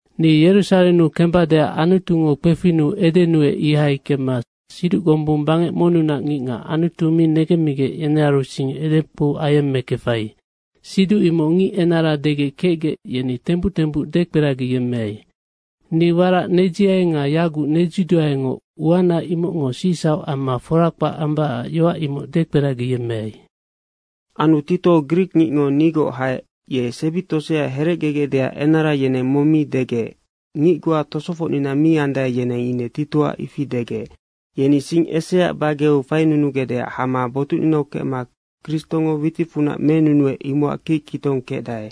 Ni Yerusarennu kembadeac Anutungo kpefinnu edenuec. Ihai kemma siduc gombung bangec monnunac ngicngac Anutu mi negemmigec, yenearu sing edekpou ayemmekefai siduc imoc ngic enara degec kecgec, yeni tembuc tembuc dekperagiyemmeai. Ni warac nedziai nga yaguc nedziduaengoc, uana imocngo sicsauc amma fora kpac ambacac yoac imoc dekperagiyemmeai. Anu Tito grikngicngo nigoc haec, ye sebi tosea herecgegecdeac enara yeneng mong mi degec. Ngic goa tosofocnina mi andae, yeneng ine Titoac ifi degec. Yeni sing eseaac bageu fainunugecdeac hama botucninau kecma Kristongo witicfunac menunuec, imocac kickitong kecdae.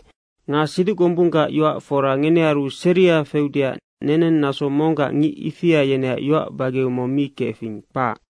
Nga siduc gombunggac yoac fora ngenearu seria feudeac neneng naso monggac ngic ifia yeneac yoac bageau mong mi kefing, kpac.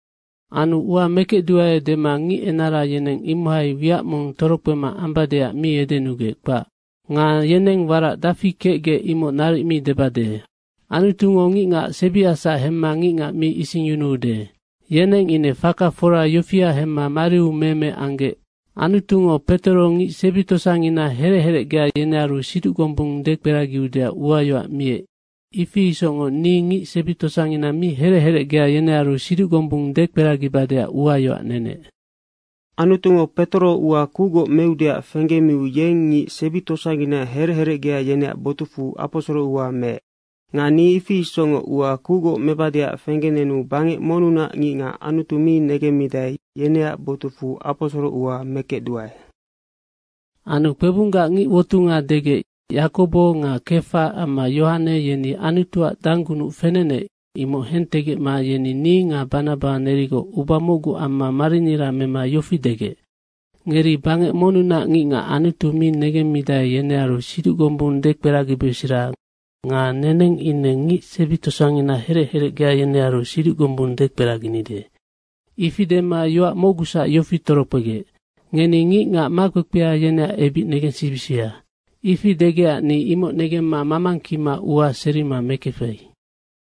Anu ua mekecduae dema ngic enara yeneng imohai wiac mong torokpema ambadeac mi edenugec, kpac. Nga yeneng warac dafi kecgec, imoc naric mi debade. Anutungo ngic sebiacsac hemma ngicngac mi isingyunuude. Yeneng ine faka fora yofia hemma mariu meme anggec. Anutungo Petoro ngic sebi tosangina herec herecgea yenearu siduc gombung dekperagiudeac uayoac miec, ifi isocngoc ni ngic sebi tosangina mi herec herecgea, yenearu siduc gombung dekperagibadeac uayoac nenec. Anutungo Petoro ua kucgoc meudeac fenggemiu, yeng ngic sebi tosangina herec herecgea, yeneac botucfu aposoro ua meec. Nga ni ifi isocngoc ua kucgoc mebadeac fenggenenu bangec monnunac ngicngac Anutu mi negemmidae, yeneac botucfu aposoro ua mekecduae. Anu kpebunggac ngic wotunga degec, Yakobo nga Kefa amma Yohane, yeni Anutuac danggunuc fenenec, imoc hentegecma yeni ni nga Banaba nerigoc uba mocgu amma marinira mema yofi degec, “Ngeri bangec monnunac ngicngac Anutu mi negemmidae, yenearu siduc gombung dekperagibesera nga neneng ngic sebi tosangina herec herecgea, yenearu siduc gombung dekperaginide.” Ifi dema yoac mocgusac yofi torokpegec, “Ngeni ngicngac makpekpea, yeneac ebic negensibisia.” ifi degecac ni imocnoc negemma mamangkima ua serima mekefai.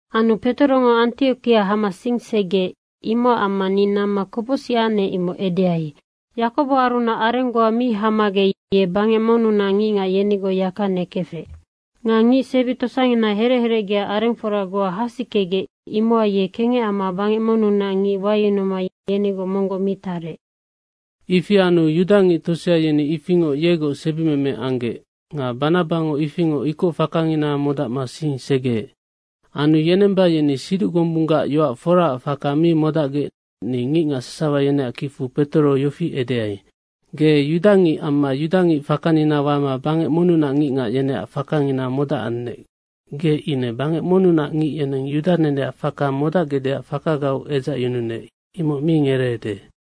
Anu Petorongo Antiokia hama sing segeec. Imocac amma ni namma kopocsic anec, imoc edeai. Yakoboarunac areng goa mi hamagec ye bangec monnunac ngicngac yenigoc yaka nekefec. Nga ngic sebi tosangina herec herecgea arengfora goa hasikegec, imohai ye kengec amma bangec monnunac ngic wayunuma yenigoc monggoc mi tarec. Ifi anu yudangic tosea yeni ifingoc yegoc sebimeme anggec. Nga Banabango ifingoc ikoc fakangina modacma sing segeec. Anu yenemba, yeni siduc gombunggac yoac foraac faka mi modacgec, ni ngicngac sasawa yeneac kicfu Petoro yofi edeai, “Ge yudangicnoc amma yudangic fakanina wama bangec monnunac ngicngac, yeneac faka modacannec, ge ine bangec monnunac ngic, yeneng yuda neneac faka modacgecdeac fakagau edzacyununec, imoc mi ngereede.”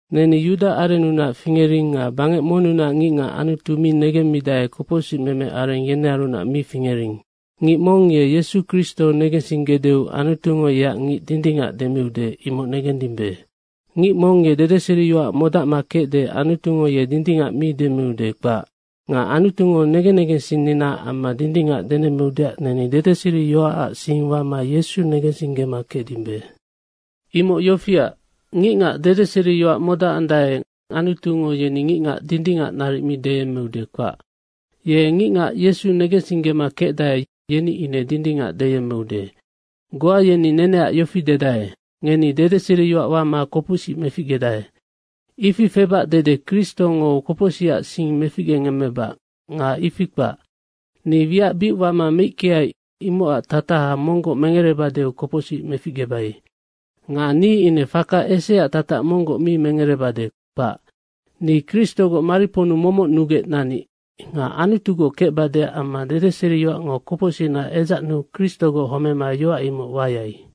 Neni yuda arennunac fingering nga bangec monnunac ngicngac Anutu mi negemmidae, kopocsicmeme areng yenearunac mi fingering. Ngic mong ye Yesu Kristo negensinggedeu Anutungo yeac ngic dindingac demiude, imoc negendimbe. Ngic mong ye dedeseriyoac modacma kecde, Anutungo ye dindingac mi demiude, kpac. Nga Anutungo negen negensinninaac amma dindingac denemmeudeac neni dedeseriyoacac sing wama Yesu negensinggema kecdimbe. Imoc yofiac, ngicngac dedeseriyoac modacandae, Anutungo yeni ngicngac dindingac naric mi deyemmeude, kpac. Ye ngicngac Yesu negensinggema kecdae, yeni ine dindingac deyemmeude. Goa yeni neneac yofi dedae, “Ngeni dedeseriyoac wama kopocsic meficgedae.” Ifi febac dede Kristongo kopocsicac sing meficgengemmebac nga ifi kpac. Ni wiac bic wama meickeai, imocac tataha monggoc mengerebadeu kopocsic meficgebai. Nga ni ine faka eseaac tatac monggoc mi mengerebade, kpac. Ni Kristogoc mariponnu momoc nugec nanic. Nga Anutugoc kecbadeac amma dedeseriyoacngo kopocsicna edzacnuu Kristogoc homema yoac imoc wayai.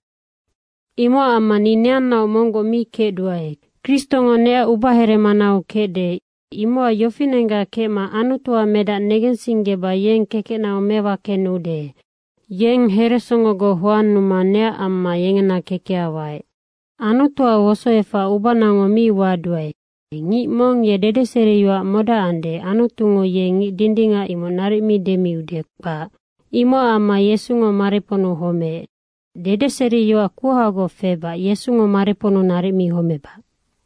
Imocac amma ni neannaoc monggoc mi kecduae. Kristongo neac ubaheremanau kecde. Imocac yofinenggac kecma Anutuac Medac negensinggeba yeng kekecnau mewakenude. Yennoc heresongogoc hoannuma neac amma yengena kekeha waec. Anutuac wosoefac ubanango mi waduae. Ngic mong ye dedeseriyoac modacande, Anutungo ye ngic dindingac imoc naric mi demiude, kpac. Imocac amma Yesungo mariponnu homeec. Dedeseriyoac kuhagoc febac Yesungo mariponnu naric mi homebac.